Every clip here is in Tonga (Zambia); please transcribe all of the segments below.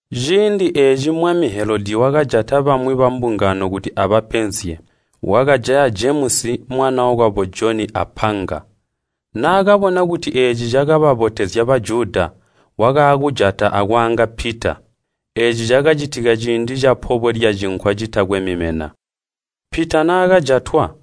Ciindi eeci mwami Helodi wakajata bamwi bambungano kuti abapenzye. Wakajaya Jemusi, mwanookwabo Joni apanga. Naakabona kuti eeci cakababotezya Bajuda, wakaakujata akwaanga Pita. (Eeci cakacitika ciindi capobwe lya Cinkwa Citakwe Mimena.) Pita naakajatwa,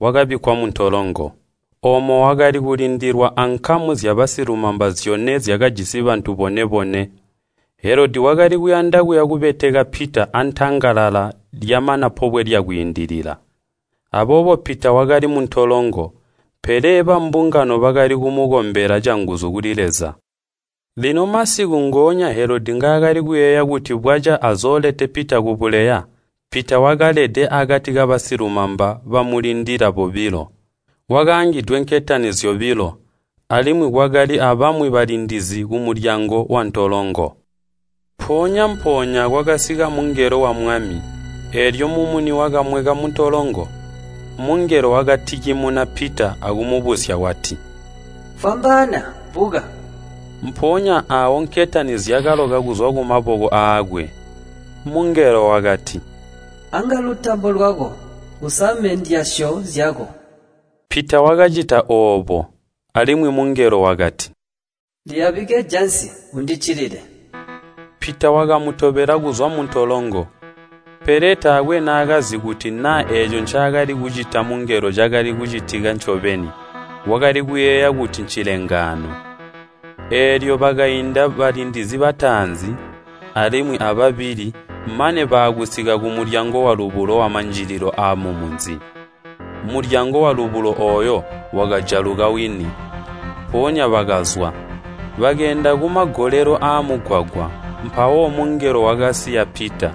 wakabikkwa muntolongo. Oomo wakali kulindilwa ankamu zyabasilumamba zyone zyakajisi bantu bone-bone. Helodi wakali kuyanda kuya kubeteka Pita antangalala lyamana Pobwe lya Kwiindilila. Aboobo Pita wakali muntolongo, pele bambungano bakali kumukombela canguzu kuli Leza. Lino masiku ngoonya Helodi ngaakali kuyeeya kuti bwaca azoolete Pita kubuleya, Pita wakalede akati kabasilumamba bamulindilila bobilo. Wakaangidwe nketani zyobilo, alimwi kwakali abamwi balindizi kumulyango wantolongo. Mpoonya-mpoonya kwakasika mungelo wa Mwami, eelyo mumuni wakamweka muntolongo. Mungelo wakatikimuna Pita akumubusya wati, “Fwamba! Buka!” Mpoonya aawo nketani zyakaloka kuzwa kumaboko aakwe. Mungelo wakati, “Anga lutambo lwako, usame ndyasyo zyako.” Pita wakacita oobo. Alimwi mungelo wakati, “Liyabike jansi, undiccilile!” Pita wakamutobela kuzwa muntolongo. Pele taakwe naakazi kuti naa eeco ncaakali kucita mungelo cakali kucitika ncobeni. Wakali kuyeeya kuti ncilengaano. Eelyo bakainda balindizi bataanzi, alimwi ababili, mane baakusika kumulyango walubulo wamanjililo aamumunzi. Mulyango walubulo ooyo wakajaluka wini, mpoonya bakazwa. Bakeenda kumagolelo amugwagwa, mpawo mungelo wakasiya Pita.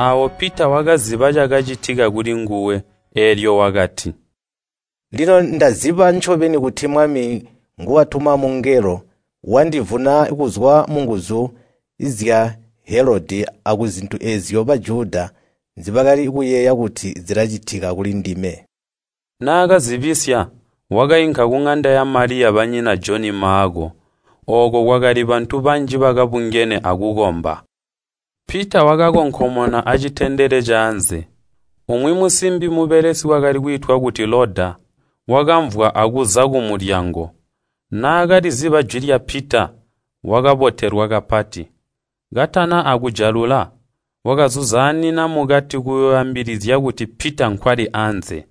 Aawo Pita wakaziba cakacitika kulinguwe, eelyo wakati, “Lino ndaziba ncobeni kuti Mwami nguwatuma mungelo, wandivuna kuzwa munguzu zya Helodi akuzintu eezyo Bajuda nzibali kuyeeya kuti zilacitika kulindime.” Naakazibisya, wakainka kuŋanda ya Maliya banyina Joni Maako. Ooko kwakali bantu banji bakabungene akukomba. Pita wakakonkomona acitendele caanze, umwi musimbi mubelesi wakali kwiitwa kuti Loda wakamvwa akuza kumulyango. Naakaliziba jwi lya Pita, wakabotelwa kapati. Katana akujalula, wakazuzaanina mukati kuyooambilizya kuti “Pita nkwali anze!”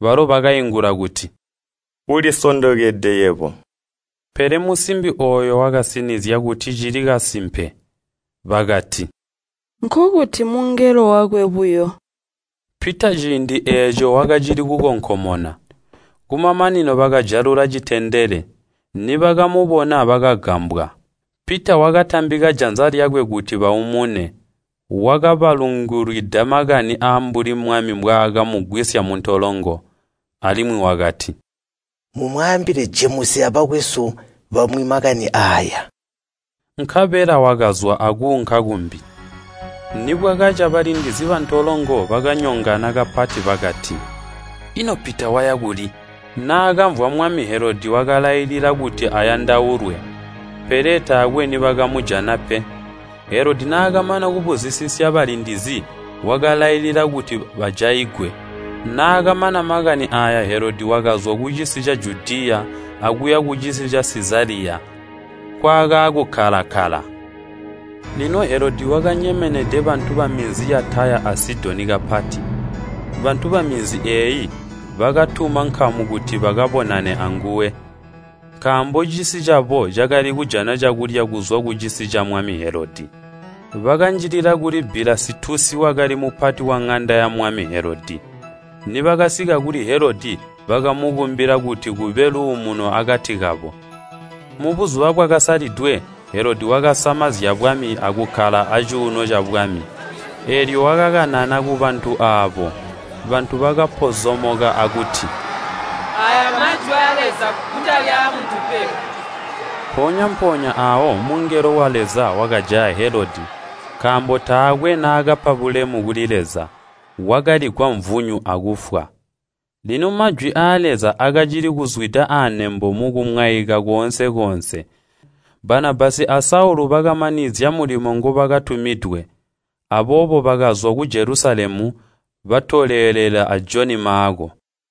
Balo bakaingula kuti, “Ulisondokede yebo.” Pele musimbi ooyo wakasinizya kuti cili kasimpe. Bakati, “Nkokuti mungelo wakwe buyo.” Pita ciindi eeco wakacili kukonkomona. Kumamanino bakajalula citendele, nibakamubona bakagambwa. Pita wakatambika janza lyakwe kuti baumune, wakabalungulwida makani aambuli Mwami mbwaaakamugwisya muntolongo. Alimwi wakati, “Mumwaambile Jemusi abakwesu bamwi makani aaya.” Nkabela wakazwa akuunka kumbi. Nibwakaca balindizi bantolongo bakanyongana kapati. Bakati, “Ino Pita waya kuli?” Naakamvwa, mwami Helodi wakalailila kuti ayandaulwe. Pele taakwe nibakamujana pe. Helodi naakamana kubuzisisya balindizi wakalailila kuti bajaigwe. Naakamana makani aaya Helodi wakazwa kucisi ca Judiya akuya kucisi ca Sizaliya nkwaakaakukkala-kkala. Lino Helodi wakanyemenede bantu baminzi ya Taya a Sidoni kapati. Bantu baminzi eeyi bakatuma nkamu kuti bakabonane anguwe. Nkaambo cisi cabo cakali kujana cakulya kuzwa kucisi camwami Helodi. Bakanjilila kuli Bilasitusi wakali mupati waŋanda yamwami Helodi. Nibakasika kuli Helodi bakamukumbila kuti kube luumuno akati kabo. Mubuzuba bwakasalidwe, Helodi wakasama zyabwami akukkala acuuno cabwami, eelyo wakakanana kubantu aabo. Bantu bakapozomoka akuti, “Aaya mmajwi aa Leza kutali aamuntu pe!” Mpoonya-mpoonya aawo mungelo wa Leza, wakajaya Helodi, nkaambo taakwe naakapa bulemu kuli Leza. Wakaligwa mvunyu akufwa. Lino majwi aa Leza akacili kuzwida anembo mukumwaika koonse-koonse. Banabasi a Saulu bakamanizya mulimo ngubakatumidwe, aboobo bakazwa ku Jelusalemu, batolelela a Joni Maako.